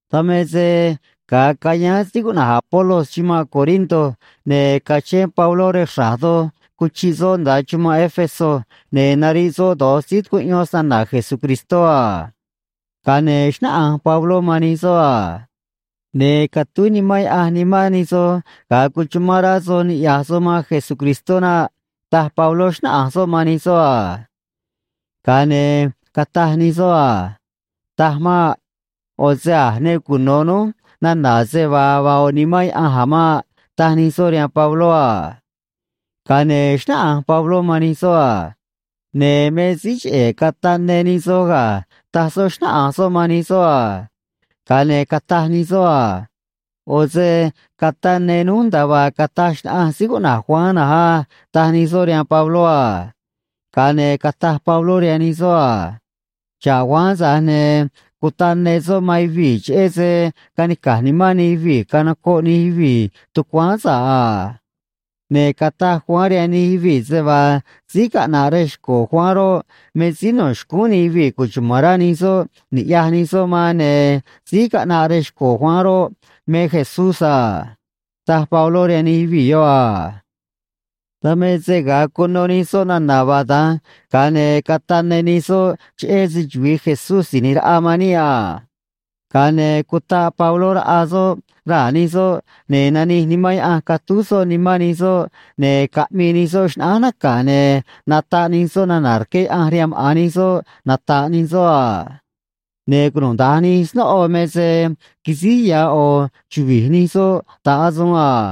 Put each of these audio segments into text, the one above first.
Dan me se ga̱a cayáán síí cuꞌna̱j Apolos chumanꞌ Corinto, ne̱ cachén Pabló rej xra̱j doj cuchiꞌ soꞌ nda̱a chumanꞌ Éfeso, ne̱ nariꞌ soꞌ do̱j síí tucuꞌyón snana̱ Jesucristó a. Ga̱a ne̱ xnáꞌanj Pabló man nij soꞌ a: ―Ne̱ catúj Nimán Yaꞌanj nimán nij soj ga̱a cuchumán rá soj niꞌya̱j soj man Jesucristó naꞌ ―taj Pabló, xnáꞌanj soꞌ man nij soꞌ a. Ga̱a ne̱ cataj nij soꞌ a: ―Taj maꞌ. ꞌO̱ se a̱ ne cuno̱ núj nana̱ se vaa vaa ꞌo̱ Nimán Yaꞌanj a̱ maꞌ ―taj nij soꞌ rihaan Pabló a. Ga̱a ne̱ xnáꞌanj Pabló man nij soꞌ a: ―Ne̱ me síí cheꞌe̱ cataꞌ ne nij soj ga̱ ―taj soꞌ, xnáꞌanj soꞌ man nij soꞌ a. Ga̱a ne̱ cataj nij soꞌ a: ―ꞌO̱ se cataꞌ ne núj nda̱a vaa cataj xnaꞌanj síí cuꞌna̱j Juan na̱nj á ―taj nij soꞌ rihaan Pabló a. Ga̱a ne̱ cataj Pabló rihaan nij soꞌ a: ―Xa̱ꞌ Juan, tza̱j ne̱ cutaꞌ ne soꞌ man yuvii̱ cheꞌé se canica̱j nimán nij yuvii̱ canocoꞌ nij yuvii̱ tucuáán sa̱ꞌ a. Ne̱ cataj Juan rihaan nij yuvii̱ se vaa síí caꞌna̱ꞌ rej xco̱ Juan roꞌ, me síí no̱ xcúún nij yuvii̱ cuchuma̱n rá nij soꞌ ni̱ꞌyaj nij soꞌ man, ne̱ síí caꞌnaꞌ rej xco̱ Juan roꞌ, me Jesús a ―taj Pabló rihaan nij yuvii̱ yoꞌ a. Dan me se ga̱a cuno nij soꞌ nana̱ vaa da̱nj, ga̱a ne̱ cataꞌ ne nij soꞌ cheꞌé se‑chuvi̱i Jesús Si̱j ꞌNi̱j Raꞌa man níꞌ a. Ga̱a ne̱ cutaꞌ Pabló raꞌa soꞌ raa̱ nij soꞌ, ne̱ nanij Nimán Yaꞌanj catúj soꞌ nimán nij soꞌ, ne̱ caꞌmii nij soꞌ xnaꞌánj naca̱, ne̱ nataꞌ nij soꞌ nana̱ rqué Yaꞌanj rihaan maꞌa̱n nij soꞌ nata̱ꞌ nij soꞌ a. Ne̱ cunuda̱nj nij snóꞌo me se quisíj ya̱ ꞌo̱ chuvi̱j nij soꞌ ta̱ꞌ asuun a.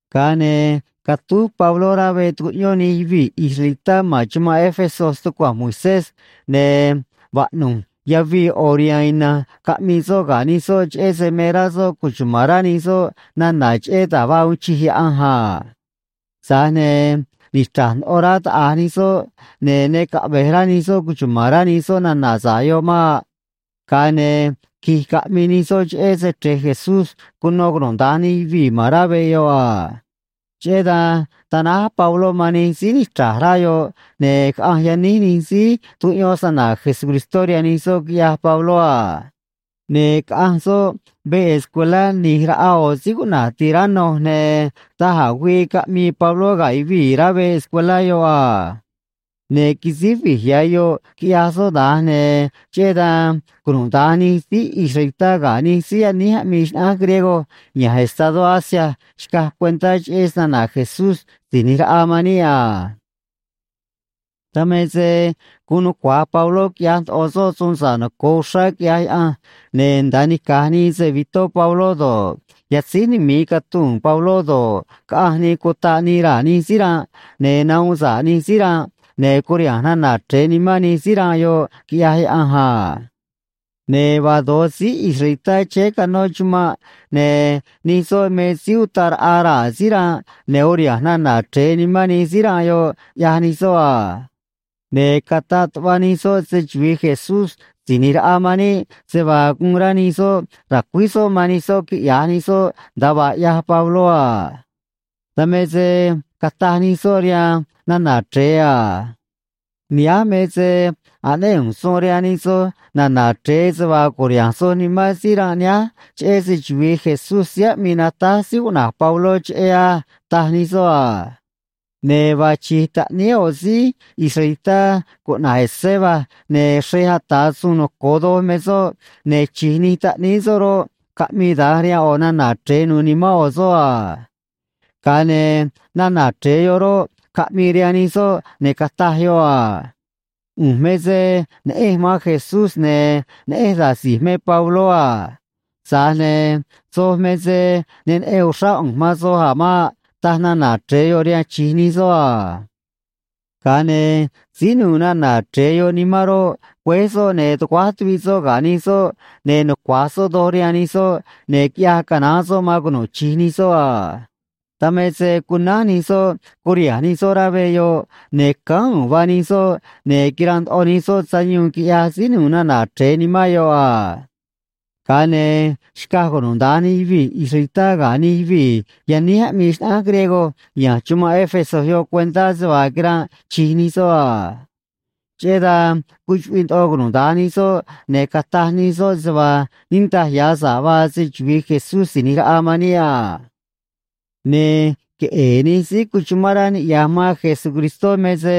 Ga̱a ne̱ catúj Pabló rá veꞌ tucuꞌyón nij yuvii̱ israelitá ma̱n chumanꞌ Éfeso stucua̱nj Moisés, ne̱ vaꞌnu̱j yavii ꞌo̱ riha̱a̱n ina̱nj caꞌmii soꞌ ga̱ nij soꞌ cheꞌé se me rá soꞌ cuchuma̱n rá nij soꞌ nana̱ cheꞌé da̱j vaa uun chij Yaꞌanj a. Tza̱j ne̱ nichra̱j ndoꞌo rá taꞌa̱j nij soꞌ, ne̱ ne caꞌve̱j rá nij soꞌ cuchuma̱n rá nij soꞌ nana̱ sa̱ꞌ yoꞌ maꞌ. Ga̱a ne̱ qui̱j caꞌmii nij soꞌ cheꞌé Se‑Chre̱j Jesús cuno cunuda̱nj nij yuvii̱ ma̱n rá veꞌ yoꞌ a. Cheꞌé dan tanáj Pabló man nij síí nichra̱j rá yoꞌ, ne̱ caꞌanj yaníj nij síí tucuꞌyón snana̱ Jesucristó rihaan nij soꞌ, quiꞌyaj Pabló a. Ne̱ caꞌanj soꞌ veꞌ escuelá ꞌni̱j raꞌa ꞌo̱ síí cuꞌna̱j Tiranno, ne̱ da̱j a̱ güii caꞌmii Pabló ga̱ yuvii̱ rá veꞌ escuelá yoꞌ a. Ne̱ quisíj vi̱j ya̱ yoꞌ quiꞌyaj soꞌ da̱nj, ne̱ cheꞌé dan cunuda̱nj nij síí israelitá ga̱ nij síí yaníj aꞌmii xnaꞌánj griego ya̱nj estadó Asia xcaj cuentá cheꞌé snana̱ Jesús Si̱j ꞌNi̱j Raꞌa man níꞌ a. Dan me se guun nucua̱j Pabló quiꞌyaj ndoꞌo soꞌ suun sa̱ꞌ noco̱o uxrá, quiꞌyaj Yaꞌanj, ne̱ nda̱a nica̱j nii se‑vi̱tó Pabló do̱ꞌ, yatzíj numi̱i catuu̱n Pabló do̱ꞌ, caꞌanj nii cutaꞌ nii raa̱ nij síí ranꞌ, ne̱ nahuun sa̱ꞌ nij síí ranꞌ, ne̱ curiha̱nj nana̱ chre̱e nimán nij síí ranꞌ yoꞌ, quiꞌyaj Yaꞌanj a. Ne̱ vaa do̱j síí israelitá chéé canó chumanꞌ, ne̱ nij soꞌ me síí utaꞌ raꞌa raa̱ síí ranꞌ ne̱ uriha̱nj nana̱ chre̱e nimán nij síí ranꞌ yoꞌ, ꞌyaj nij soꞌ a. Ne̱ cataꞌ tuꞌva nij soꞌ se‑chuvi̱i Jesús Si̱j ꞌNi̱j Raꞌa man níꞌ se vaa guun rá nij soꞌ ra̱cuíj soꞌ man nij soꞌ quiꞌya̱j nij soꞌ nda̱a vaa ꞌyaj Pabló a. Dan me se cataj nij soꞌ rihaan nana̱ chre̱e a: ―Nihánj me se aꞌnéꞌ ꞌu̱nj suun rihaan nij soj na̱na̱ chre̱e se vaa cu̱riha̱nj soj nimán síí ranꞌ nihánj cheꞌé se‑chuvi̱i Jesús síí aꞌmii natáj síí cuꞌna̱j Pabló cheꞌé á ―taj nij soꞌ a. Ne̱ vaa chi̱j taꞌníí ꞌo̱ síí israelitá cuꞌna̱j Esceva, ne̱ xrej ata̱ suun noco̱o doj me soꞌ, ne̱ chi̱j nij taꞌníí soꞌ roꞌ, caꞌmii da̱nj rihaan ꞌo̱ nana̱ chre̱e nu̱u̱ nimán ꞌo̱ soꞌ a. Ga̱a ne̱ nana̱ chre̱e yoꞌ roꞌ, caꞌmii rihaan nij soꞌ, ne̱ cataj yoꞌ a: ―ꞌU̱nj me se neꞌenj man Jesús, ne̱ neꞌenj da̱j si̱j me Pabló a. Tza̱j ne̱ soj me se ne neꞌen uxrá ꞌu̱nj man soj a̱ maꞌ ―taj nana̱ chre̱e yoꞌ rihaan chi̱j nij soꞌ a. Ga̱a ne̱ síí nu̱u̱ nana̱ chre̱e yoꞌ nimán roꞌ, güéj soꞌ, ne̱ tuguáj tuviꞌ soꞌ ga̱ nij soꞌ, ne̱ nucua̱j soꞌ doj rihaan nij soꞌ, ne̱ quiꞌyaj canaán soꞌ man cunu̱ꞌ chi̱j nij soꞌ a. Dan me se cunánj nij soꞌ, curiha̱nj nij soꞌ rá veꞌ yoꞌ, ne̱ cánj u̱u̱n vaa nij soꞌ, ne̱ quiranꞌ ndoꞌo nij soꞌ sayuun, quiꞌyaj síí nu̱u̱ nana̱ chre̱e nimán yoꞌ a. Ga̱a ne̱ xcaj cunuda̱nj nij yuvii̱ israelitá ga̱ nij yuvii̱ yaníj aꞌmii xnaꞌánj griego ya̱nj chumanꞌ Éfeso yoꞌ cuentá se vaa quiranꞌ chi̱j nij soꞌ a. Cheꞌé dan cuchuꞌviꞌ ndoꞌo cunuda̱nj nij soꞌ, ne̱ cataj nij soꞌ se vaa niꞌndaj ya̱ sa̱ꞌ vaa se‑chuvi̱i Jesús Si̱j ꞌNi̱j Raꞌa man níꞌ a. Ne̱ queꞌe̱e̱ nij síí cuchumán rá niꞌya̱j man Jesucristó me se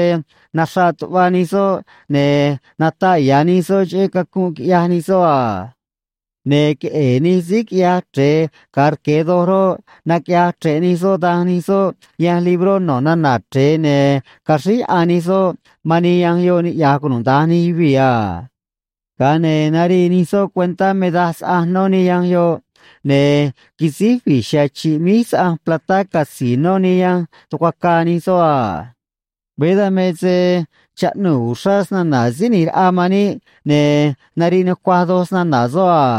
naxraꞌ tuꞌva nij soꞌ, ne̱ nataꞌ ya̱ nij soꞌ cheꞌé cacunꞌ quiꞌyaj nij soꞌ a. Ne̱ queꞌe̱e̱ nij síí quiꞌyaj chre̱e ga̱a rque̱ doj roꞌ, naquiꞌyaj chre̱ꞌ nij soꞌ danj nij soꞌ yanj libró no̱ nana̱ chre̱e, ne̱ caxríj yaꞌan nij soꞌ man nij yanj yoꞌ, niꞌya̱j cunuda̱nj nij yuvii̱ a. Ga̱a ne̱ narii nij soꞌ cuentá me daj saꞌanj nó nij yanj yoꞌ, ne̱ quisíj vi̱j chiha̱a̱ chi̱ꞌ míj saꞌanj platá catzi̱i̱ nó nij yanj tucuacaa nij soꞌ a. Veé dan me se chaꞌnuu̱ uxrá snana̱ Síí ꞌNi̱j Raꞌa man níꞌ, ne̱ nariꞌ nucuaj doj snana̱ soꞌ a.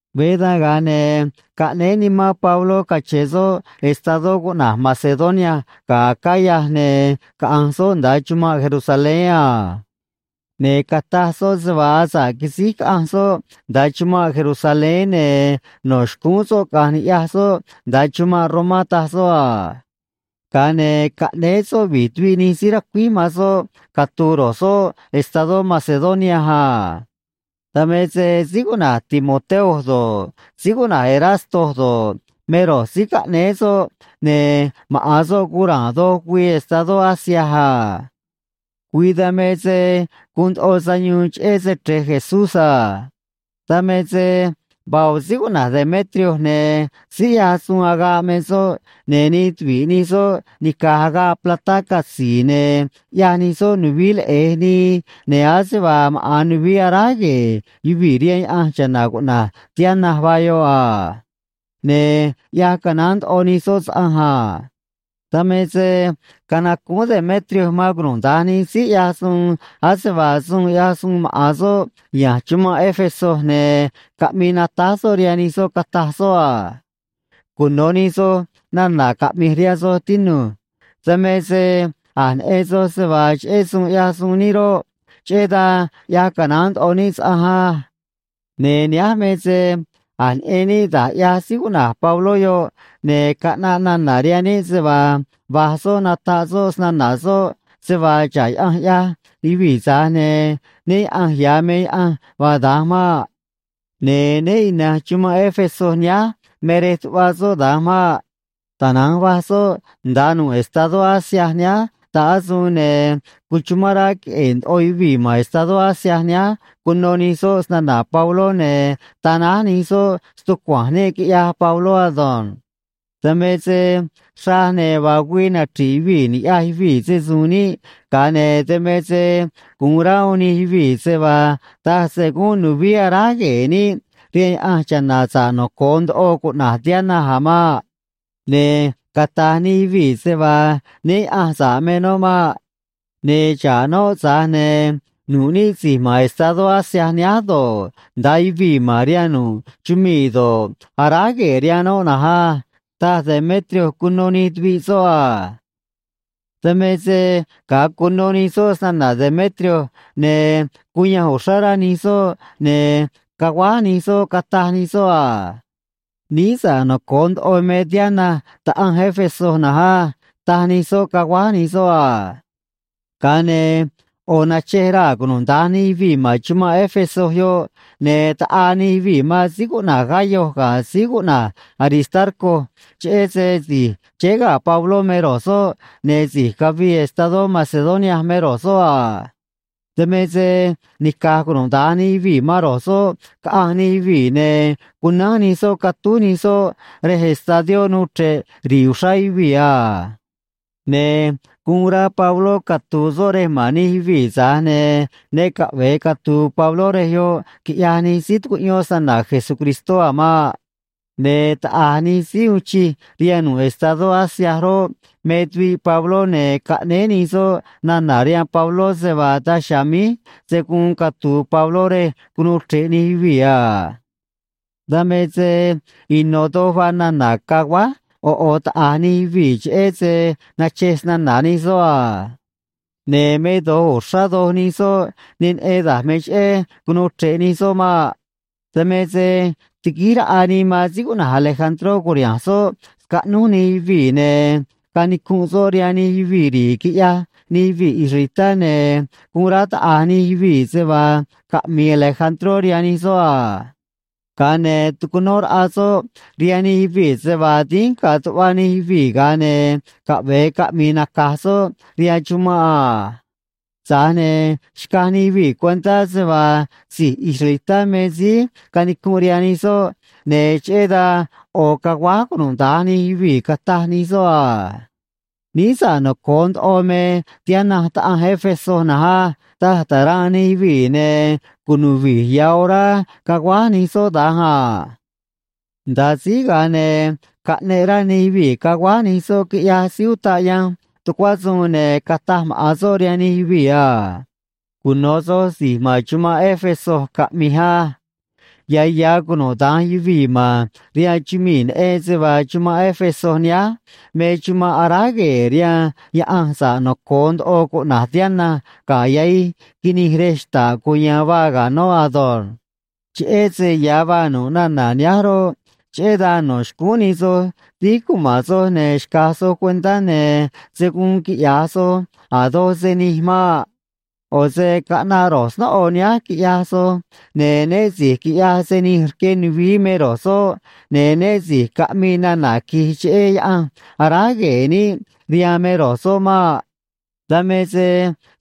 Veé dan ga̱a ne̱ caꞌnéé nimán Pabló cache̱n soꞌ estadó cuꞌna̱j Macedonia ga̱ Acaya ne̱ caꞌa̱nj soꞌ nda̱a chumanꞌ Jerusalén a. Ne̱ cataj soꞌ se vaa asa̱ꞌ quisíj caꞌanj soꞌ nda̱a chumanꞌ Jerusalén, ne̱ no̱ xcúún soꞌ caꞌa̱nj ni̱ꞌyaj soꞌ nda̱a chumanꞌ Romá, taj soꞌ a. Ga̱a ne̱ caꞌnéé soꞌ vi̱j tuviꞌ nij síí racuíj man soꞌ catu̱u̱ ro̱j soꞌ estadó Macedonia a. Dan me se síí cuꞌna̱j Timoteo do̱ꞌ, síí cuꞌna̱j Erasto do̱ꞌ, me ro̱j síí caꞌnéé soꞌ, ne̱ maꞌa̱n soꞌ guun ra̱a̱n do̱j güii estadó Asia a. Güii dan me se guun ndoꞌo sayuun cheꞌé Se‑Chre̱j Jesús a. Dan me se vaa ꞌo̱ síí cuꞌna̱j Demetrio ne̱ síí ꞌyaj suun agaꞌ me soꞌ, ne̱ nij tuvi̱ꞌ nij soꞌ nica̱j agaꞌ platá catzi̱i̱ ne̱ ꞌyaj nij soꞌ nuvií leꞌe̱j nii, ne̱ ase vaa maꞌa̱n nuvií aráj gue̱e̱ yuvii̱ rihaan yaꞌanj cha̱na̱ cuꞌna̱j Diana vaa yoꞌ a. Ne̱ ꞌyaj canaán ndoꞌo nij soꞌ saꞌanj a. Dan me se canacúún Demetrio man cunuda̱nj nij síí ꞌyaj suun ase vaa suun ꞌyaj suun maꞌa̱n soꞌ ya̱nj chumanꞌ Éfeso, ne̱ caꞌmii natáj soꞌ rihaan nij soꞌ, cataj soꞌ a: ―Cuno̱ nij soj nana̱ caꞌmi̱j rihaan soj, tinu̱j. Dan me se a̱j neꞌen soj se vaa cheꞌé suun ꞌyaj suun níꞌ roꞌ, cheꞌé dan ꞌyaj canaán ndoꞌo níꞌ saꞌanj á. Ne̱ nihánj me se a̱j neꞌen níꞌ da̱j ꞌyaj síí cuꞌna̱j Pabló yoꞌ, ne̱ caꞌnaꞌ nana̱ rihaan níꞌ se vaa va̱j soꞌ nataꞌ soꞌ snana̱ soꞌ se vaa xa̱ꞌ yaꞌanj ꞌyaj yuvii̱, tza̱j ne̱ né yaꞌa̱nj ya̱ me yaꞌanj vaa da̱nj maꞌ. Ne̱ né ina̱nj chumanꞌ Éfeso nihánj me rej tuꞌva soꞌ da̱nj maꞌ. Tana̱nj va̱j soꞌ nda̱a nu̱ꞌ estadó Asia nihánj ta̱ꞌ asuun, ne̱ cuchumán rá queꞌe̱e̱ ndoꞌo yuvii̱ ma̱n estadó Asia nihánj cuno nij soꞌ snana̱ Pabló, ne̱ tanáj nij soꞌ stucua̱nj níꞌ quiꞌyaj Pabló ado̱nj. Dan me se xraj ne̱ vaa güii nachri̱ꞌ yuvii̱ ni̱ꞌyaj yuvii̱ se‑su̱u̱n níꞌ, ga̱a ne̱ dan me se gu̱un rá uún nij yuvii̱ se vaa taj se gúnꞌ nuvií aráj gue̱e̱ níꞌ rihaan yaꞌanj cha̱na̱ sa̱ꞌ noco̱o ndoꞌo cuꞌna̱j Diana a̱ maꞌ. Ne̱ cata̱j nij yuvii̱ se vaa né yaꞌa̱nj sa̱ꞌ me noꞌ maꞌ. Ne̱ xa̱ꞌ noꞌ, tza̱j ne̱ nu̱ꞌ níꞌ si̱j ma̱n estadó Asia nihánj do̱ꞌ, nda̱a yuvii̱ ma̱n rihaan nu̱ꞌ chumii̱ do̱ꞌ, aráj gue̱e̱ rihaan noꞌ na̱nj á ―taj Demetrio cuno nij tuviꞌ soꞌ a. Dan me se ga̱a cuno nij soꞌ snana̱ Demetrio, ne̱ cuyanj uxrá rá nij soꞌ, ne̱ caguáj nij soꞌ, cataj nij soꞌ a: ―Níí sa̱ꞌ noco̱o ndoꞌo me Diana taꞌanj Éfeso na̱nj á ―taj nij soꞌ, caguáj nij soꞌ a. Ga̱a ne̱ ꞌo̱ nachej raa̱ cunuda̱nj nij yuvii̱ ma̱n chumanꞌ Éfeso yoꞌ, ne̱ taꞌaa nij yuvii̱ man síí cuꞌna̱j Gayo ga̱ síí cuꞌna̱j Aristarco cheꞌé se si̱j chéé ga̱ Pabló me ro̱j soꞌ, ne̱ si̱j cavii estadó Macedonia me ro̱j soꞌ a. Dan me se nica̱j cunuda̱nj nij yuvii̱ man ro̱j soꞌ, caꞌanj nij yuvii̱, ne̱ cunánj nij soꞌ catúj nij soꞌ rej estadió nuu chre̱ꞌ ri̱i̱ uxrá yuvii̱ a. Ne̱ guun rá Pabló catu̱u̱ soꞌ rej ma̱n nij yuvii̱, tza̱j ne̱ ne caꞌve̱e catu̱u̱ Pabló rej yoꞌ quiꞌyaj nij síí tucuꞌyón snana̱ Jesucristó a̱ maꞌ. Ne̱ taꞌa̱j nij síí uun chij rihaan nu̱ꞌ estadó Asia roꞌ, me tuviꞌ Pabló, ne̱ caꞌnéé nij soꞌ nana̱ rihaan Pabló se vaa daj chiha̱a̱ míj se̱ guun catu̱u̱ Pabló rej cunuu chre̱ꞌ nij yuvii̱ a. Dan me se ino̱ doj vaa nana̱ caguáj ꞌo̱ ꞌo̱ taꞌa̱j nij yuvii̱, cheꞌé se nachej snana̱ nij soꞌ a. Ne̱ me do̱j uxrá doj nij soꞌ ne neꞌen da̱j me cheꞌé cunuu chre̱ꞌ nij soꞌ maꞌ. Dan me se tiguíj raꞌa nii man síí cuꞌna̱j Alejandró cu̱riha̱nj soꞌ scaꞌnúj nij yuvii̱, ne̱ canicunꞌ soꞌ rihaan nij yuvii̱ ri̱i̱, quiꞌyaj nij yuvii̱ israelitá, ne̱ guun rá taꞌa̱j nij yuvii̱ se vaa caꞌmi̱i̱ Alejandró rihaan nij soꞌ a. Ga̱a ne̱ tucunó raꞌa soꞌ rihaan nij yuvii̱ se vaa dínj ga̱a̱ tuꞌva nij yuvii̱, ga̱a ne̱ caꞌve̱e caꞌmi̱i̱ naca̱j soꞌ rihaan chumanꞌ a. Tza̱j ne̱ xcaj nij yuvii̱ cuentá se vaa si̱j israelitá me síí canicunꞌ rihaan nij soꞌ, ne̱ cheꞌé dan ꞌo̱ caguáj cunuda̱nj nij yuvii̱, cataj nij soꞌ a: ―Níí sa̱ꞌ noco̱o ndoꞌo me Diana taꞌanj Éfeso na̱nj á ―taj ta̱ranꞌ nij yuvii̱, ne̱ cunu̱ꞌ vi̱j ya̱ orá caguáj nij soꞌ da̱nj a. Nda̱a síj, ga̱a ne̱ caꞌneꞌ rá nij yuvii̱ caguáj nij soꞌ, quiꞌyaj síí utaꞌ yanj tucuá suun, ne̱ cataj maꞌa̱n soꞌ rihaan nij yuvii̱ a: ―Cuno̱ soj si̱j ma̱n chumanꞌ Éfeso caꞌmi̱j á. Ya̱ ya̱ cunuda̱nj yuvii̱ ma̱n rihaan chumii̱ neꞌen se vaa chumanꞌ Éfeso nihánj me chumanꞌ aráj gue̱e̱ rihaan yaꞌanj sa̱ꞌ noco̱o ndoꞌo cuꞌna̱j Diana ga̱ yahij quinij rej xta̱ꞌ cuya̱a̱n vaa ga̱ noꞌ ado̱nj. Cheꞌé se ya̱ vaa nu̱ꞌ nana̱ nihánj roꞌ, cheꞌé dan no̱ xcúún nij soj dínj cuma̱n soj, ne̱ xca̱j soj cuentá, ne̱ se̱ guun quiꞌya̱j soj a̱ doj se nij maꞌ. ꞌO̱ se caꞌnaꞌ ro̱j snóꞌo nihánj, quiꞌyaj soj, ne̱ né si̱j quiꞌyaj se nij rque nuvií me ro̱j soꞌ, ne̱ né si̱j caꞌmii nana̱ qui̱j cheꞌé yaꞌanj aráj gue̱e̱ níꞌ rihaan me ro̱j soꞌ maꞌ. Dan me se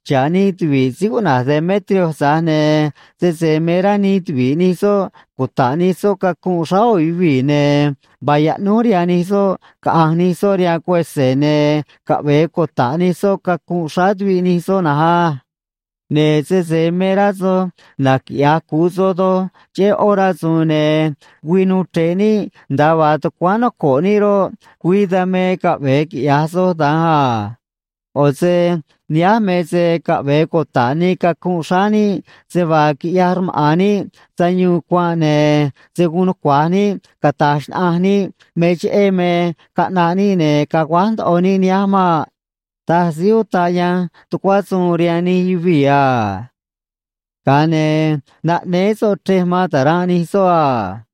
xa̱ꞌ nij tuvi̱ꞌ síí cuꞌna̱j Demetrio, tza̱j ne̱ sese me rá nij tuvi̱ꞌ nij soꞌ cuta̱ꞌ nij soꞌ cacunꞌ xráá ꞌo̱ yuvii̱, ne̱ vaa yaꞌnúj rihaan nij soꞌ caꞌa̱nj nij soꞌ rihaan cuese̱, ne̱ caꞌve̱e cuta̱ꞌ nij soꞌ cacunꞌ xráá tuviꞌ nij soꞌ na̱nj á. Ne̱ sese me rá soj naquiꞌya̱j cu̱u soj doj cheꞌé ꞌó rasu̱u̱n, ne̱ güii nu̱u̱ chre̱ꞌ níꞌ nda̱a vaa tucuáán noco̱ꞌ níꞌ roꞌ, güii dan me caꞌve̱e quiꞌya̱j soj da̱nj a. ꞌO̱ se nihánj me se caꞌve̱e cuta̱ꞌ nii cacunꞌ xráá níꞌ se vaa quiꞌyaj rmaꞌa̱n níꞌ sayuun cuanꞌ, ne̱ se̱ guun nucua̱j níꞌ cata̱j xnaꞌanj níꞌ me cheꞌé me caꞌnaꞌ níꞌ ne̱ caguáj ndoꞌo níꞌ nihánj maꞌ ―taj síí utaꞌ yanj tucuá suun rihaan nij yuvii̱ a. Ga̱a ne̱ naꞌnéé soꞌ chrej man ta̱ranꞌ nij soꞌ a.